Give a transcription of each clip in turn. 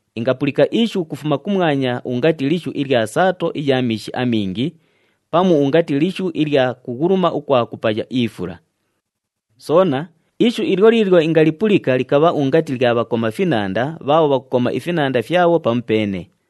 Ingapulika ishu ukufuma kumwanya ungati lishu ilya saato iya miishi amingi, pamu ungati lishu ilya kughuluma ukwa kupaya ifula. Soona, ishu ilyo liilyo ingalipulika likabha ungati lya bhakoma finanda bhaabho bhakukoma ifinanda fyabho pamupeene.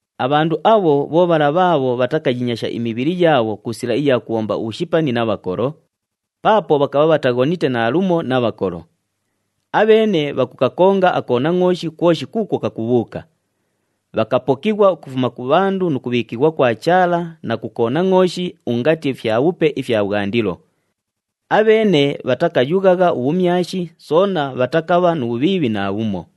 Abhandu abho bho bhala bhaabho bhatakiinyasha imibhili yaabho ku sila iya kubhomba ubhushipani na bhakolo, paapo bhakabha bhataghonite naalumo na bhakolo. Abheene bhakukakonga aKonangʼooshi kwoshi kuukwo kakubhuuka. Bhakapokighwa ukufuma ku bhandu nu kubhiikighwa kwa Chaala na ku Konangʼooshi ungati fyabhupe ifya bhwandilo. Abheene bhatakayughagha ubhumyashi soona bhatakabha nu bhubhiibhi naabhumo.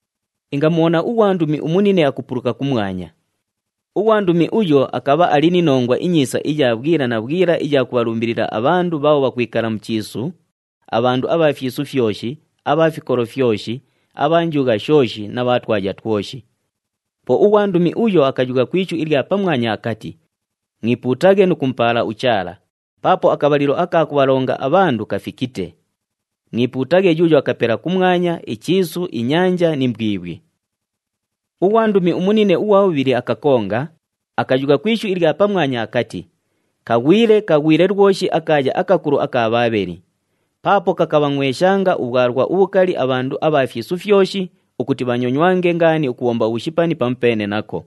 Ingamubhona ughwandumi umunine akupuluka kumwanya. Ughwandumi uyo akabha ali ni Nongwa iNyiisa iya bhwila na bhwila iya kubhalumbilila abhandu bhaabho bhakwikala mu chiisu, abhandu abha fyisu fyoshi, abha fikolo fyoshi, abha njugha shooshi na bha twaya twoshi. Po ughwandumi uyo akayugha ku ishu ilya pamwanya akati, “Mwipuutaghe nu kumupaala uChaala, paapo akabhalilo aka kubhalonga abhandu kafikite. Mwipuutaghe yuuyo akapela kumwanya, ichiisu, inyanja ni mbwibhwi.” Ughwandumi umunine ughwa bhubhili akakonga, akayugha ku ishu ilya pamwanya akati, “Kaghwile! Kaghwile lwoshi akaaya akakulu aka Bhaabheli! Paapo kakabhangʼweshanga ubhwalwa ubhukali abhandu abha fyisu fyoshi, ukuti bhanyonywange ngaani ukubhomba ubhushipani pamupeene nako.”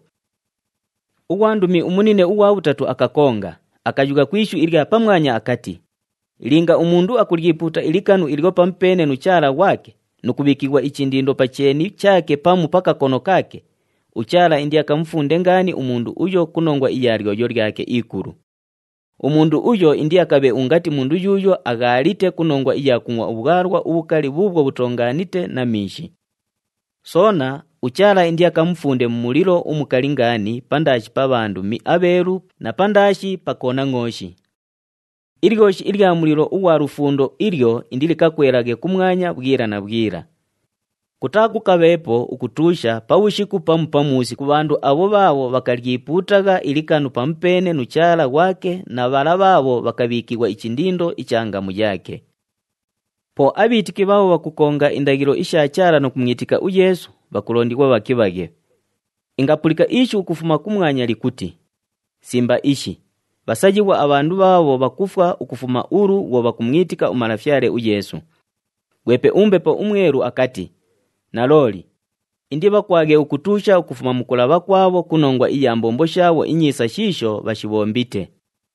Ughwandumi umunine ughwa bhatatu akakonga, akayugha ku ishu ilya pamwanya akati, “Linga umundu akulyipuuta ilikanu ilyo pamupeene nu chaala ghwake, nu kubhiikighwa ichindindo pa cheeni chaake pamu pa kakono kaake, uChaala indiakamufunde ngaani umundu uyo ku nongwa iya lyoyo lyake ikulu. Umundu uyo indiakabhe ungati mundu yuuyo aghaalite ku nongwa iya kungʼwa ubhwalwa ubhukali bhuubhwo bhutoongaanite na miishi. Soona, uChaala indiakamufunde mu mulilo umukali ngaani pandaashi pa bhandumi abheelu na pandaashi pa Konangʼooshi. Ilyoshi ilya mulilo ughwa lufundo ilyo indilikakwelaghe kumwanya bhwila na bhwila. Kutaakukabheepo ukutuusha pabhushiku pamu pamuusi ku bhandu abho bhaabho bhakalyipuutagha ilikanu pamupeene nu chaala ghwake na bhala bhaabho bhakabhiikighwa ichindindo icha ngamu yaake.” Po abhiitiki bhaabho bhakukonga indaghilo isha Chaala nu kumwitika uYeesu, bhakulondighwa bhakibhaghe. Ingapulika ishu ukufuma kumwanya likuti, “Simba ishi! Bhasayighwa abhandu bhaabho bhakufwa ukufuma ulu bhwo bhakumwitika uMalafyale uYeesu!” Ghwepe uMbepo uMwelu akati, “Nalooli! Indibhakwaghe ukutuusha ukufuma mu kulabha kwabhwo ku nongwa iya mbombo shaabho inyiisa shiisho bhashibhombite.”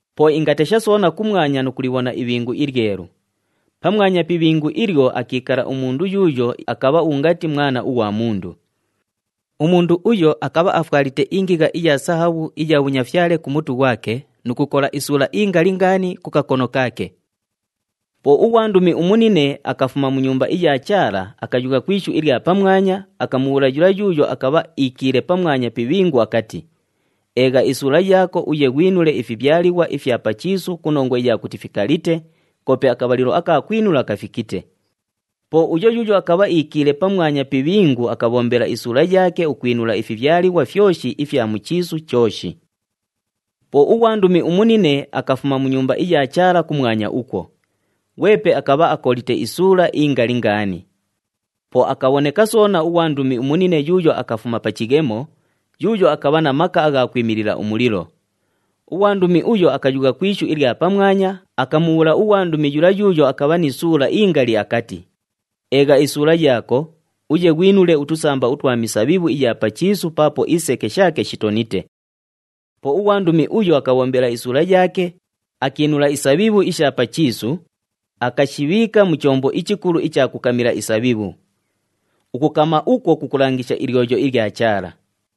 Po ingatesha soona kumwanya nu kulibhona ibhingu ilyelu. Pamwanya pi ibhingu ilyo akiikala umundu yuuyo akabha ungati Mwana ughwa Mundu. Umundu uyo akabha afwalite ingigha iya sahabhu iya bhunyafyale ku mutu ghwake nu kukola isuula ingali ngaani ku kakono kaake. Po ughwandumi umunine akafuma mu Nyumba iya Chaala, akayugha ku ishu ilya pamwanya, akamubhuula yula yuuyo akabha iikiile pamwanya pi ibhingu akati, “Eegha isuula yaako uye ghwinule ifibhyalighwa ifya pa chiisu ku nongwa iya kuti fikalite, koope akabhalilo aka kwinula kafikite.” Po uyo yuuyo akabha iikiile pamwanya pi ibhingu akabhombela isuula yaake ukwinula ifibhyalighwa fyoshi ifya mu chiisu chooshi. Po ughwandumi umunine akafuma mu Nyumba iya Chaala kumwanya ukwo. Ghwepe akabha akolite isuula ingali ngaani. Po akabhoneka soona ughwandumi umunine yuuyo akafuma pa chighemo, yuuyo akabha na maka agha kwimilila umulilo. Ughwandumi uyo akayugha ku ishu ilya pamwanya, akamubhuula ughwandumi yula yuuyo akabha ni suula ingali akati, “Eegha isuula yaako, uye ghwinule utusamba utwa misabhibhu iya pa chiisu paapo iseke shaake shitonite.” Po ughwandumi uyo akabhombela isuula yaake, akiinula isabhibhu isha pa chiisu, akashibhiika mu chombo ichikulu icha kukamila isabhibhu. Ukukama ukwo kukulangisha ilyoyo ilya Chaala.